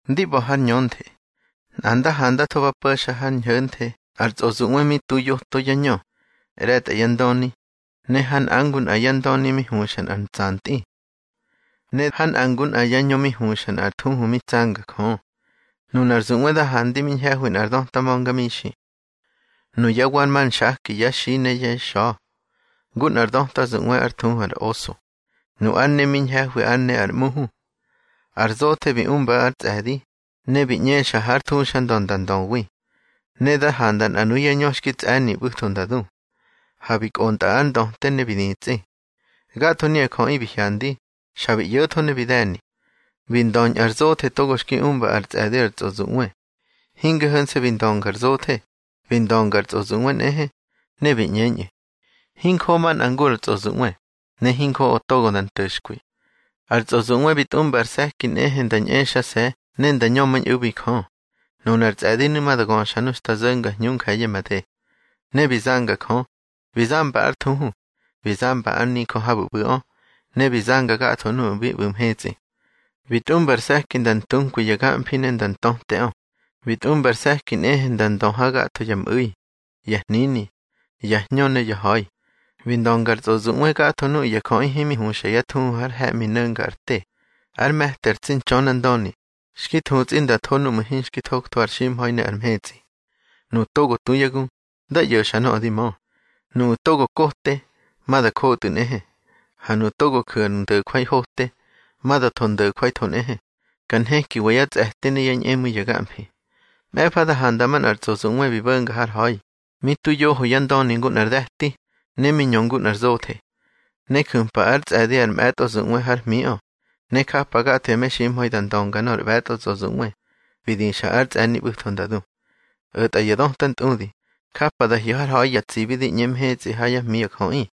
Ndi ꞌba̱ har ñönthe, nꞌa nda handatho ba po̱xa har ñho̱nthe nꞌar tsꞌozuꞌwe mi tu yoto yá ñö, ꞌre̱tꞌa yá ndöni, ne ha nꞌa ngu nꞌa yá ndöni mi huꞌsa nꞌar ntsantꞌi. Ne ha nꞌa ngu nꞌa yá ñö mi huxa nꞌar thuhu mi tsanga Jö. Nunar zuꞌwe da handi mi ñhe̱hwi nꞌar döta ma̱ngamixi. Nuyá wa mar nxaki yá xi ne yá xa̱, ngu nꞌar döta zuꞌwe ár thuhu ar oso. Nu ár ne mi ñhe̱hwi ár ne nꞌar ꞌmuhu. Ar zothe bi umba ár tsꞌe̱di, ne bi ꞌñexa hár thuxandö nda ndöwi. Ne da handa nꞌa nuyá ñö xki tsꞌe̱ni ꞌbu̱tho nda du, ha bi kꞌontꞌa ar ndöte ne bi ditsꞌi. Gatho nuya jöꞌi bi hyandi, xa bi ꞌyo̱tho ne bi de̱ni. Bi ndöñꞌu̱ ar zothe togo xki umba ar tsꞌe̱di ar tsꞌozuꞌwe. Hinge ho̱nse̱ bi ndönga ar zothe, bi ndönga ar tsꞌozuꞌwe nꞌehe, ne bi ꞌñeñꞌu̱: —Hinjoꞌo manꞌa ngu ar tsꞌozuꞌwe, ne hinjoꞌo togo da nto̱xkwi. Ar tsꞌozuꞌwe bi tꞌumba ar se̱ki nꞌehe nda ñꞌexase̱ ne nda ñömañꞌu̱bi Jö. Nunar tsꞌe̱dinu̱ ma da göxa xta zo̱nga hñu nje̱ye̱ made. Ne bi zanga Jö, bi zamba ár thuhu, bi zamba ár nijö habu̱ ꞌbu̱ꞌö, ne bi zanga gatho nuꞌu̱ bi ꞌbu̱ mhetsꞌi. Bi tꞌumba ar se̱ki nda ntunkwi ya gamfi ne nda ntöteꞌö. Bi tꞌumba ar se̱ki nꞌehe nda ndö ha gatho ya mꞌu̱i, ya hnini, ya hñö ne ya ha̱i. Bi ndönga ar tsꞌozuꞌwe gatho nuꞌu̱ ya jöꞌi himi huxa yá thuhu har he̱ꞌmi no̱nga ar te, ár me̱ti ar tsi Ntxönandöni, xki thutsꞌi nda tho núꞌmu̱ hinxki thoktho ar ximha̱i ne ar mhetsꞌi. Nuꞌu̱ togo tu yá gu, dá ꞌyo̱xa nöꞌö di mö. Nuꞌu̱ togo kote, ma da jotꞌu̱ nꞌehe. Ha nuꞌu̱ togo ju̱ ar ndo̱jwai hote, ma da tho ndo̱jwaitho nꞌehe. Ka nhekiwa yá tsꞌe̱ti ne yá ñꞌemu̱i ya gamfi. Mꞌe̱fa da handa manꞌar tsꞌozuꞌwe bi bo̱nga har ha̱i, mi tu yoho yá ndöni ngu nꞌar de̱ti, ne mi ñö ngu nꞌar zothe. Ne ju̱mpa ár tsꞌe̱di ar mꞌe̱tꞌo tsꞌozuꞌwe hár hmiꞌö, ne japa gatho ya meximha̱i da ndönga nor ꞌbe̱tꞌo tsꞌozuꞌwe bi dixa ár ntsꞌe̱ni ꞌbu̱tho nda du. O̱tꞌa ya döta ntꞌudi, japa da hyo̱ har ha̱i ya tsibi di ꞌñe mhetsꞌi ha yá hmi ya jöꞌi.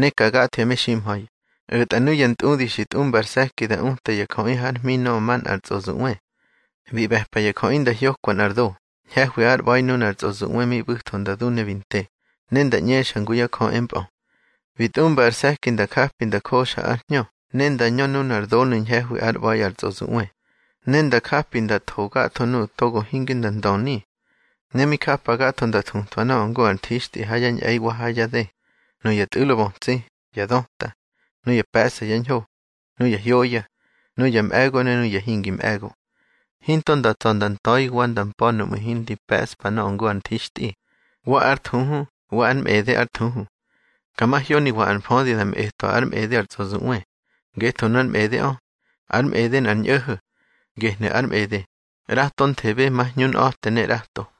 Ne ka gatho ya meximha̱i, o̱tꞌa nuya ntꞌudi xi tꞌumba ar se̱ki da uta ya jöꞌi hár hmi nöꞌö manꞌar tsꞌozuꞌwe. Bi ꞌbe̱pa ya jöꞌi nda hyokwa nꞌar do ñhe̱hwi ár ꞌba̱i nunar tsꞌozuꞌwe mi ꞌbu̱tho nda du ne bi nte, ne nda ꞌñexa ngu yá jö empꞌö. Bi tꞌumba ar se̱ki nda japi nda joxa ár hñö ne nda ñö nunar donu̱ ñhe̱hwi ár ꞌba̱i ar tsꞌozuꞌwe, ne nda japi nda tho gatho nuꞌu̱ togo hinge nda ndöni. Ne mi japa gatho nda thutwa nöꞌö ngu ar nthixtꞌi ha yá ñꞌe̱i wa ha yá dë, nuya tꞌu̱lo bötsi, ya döta, nuya pe̱ꞌsa yá ñho, nuya hyoya, nuya mꞌe̱go ne nuya hingi mꞌe̱go. Hinto da tsa̱ da nta̱i wa da mpa̱ nuꞌmu̱ hindi pe̱ꞌspa nöꞌö ngu ar nthixtꞌi, wa ár thuhu wa ár mꞌede ár thuhu. Ka mahyoniwa ar mfödi da mꞌetwa ár mꞌede ar tsꞌozuꞌwe, ngetho nu ár mꞌedeꞌö, ár mꞌede nꞌar ñꞌo̱ho̱. Gehnu̱ ar mꞌede: ꞌratonthebe ma hñunꞌa̱te ne ꞌrato.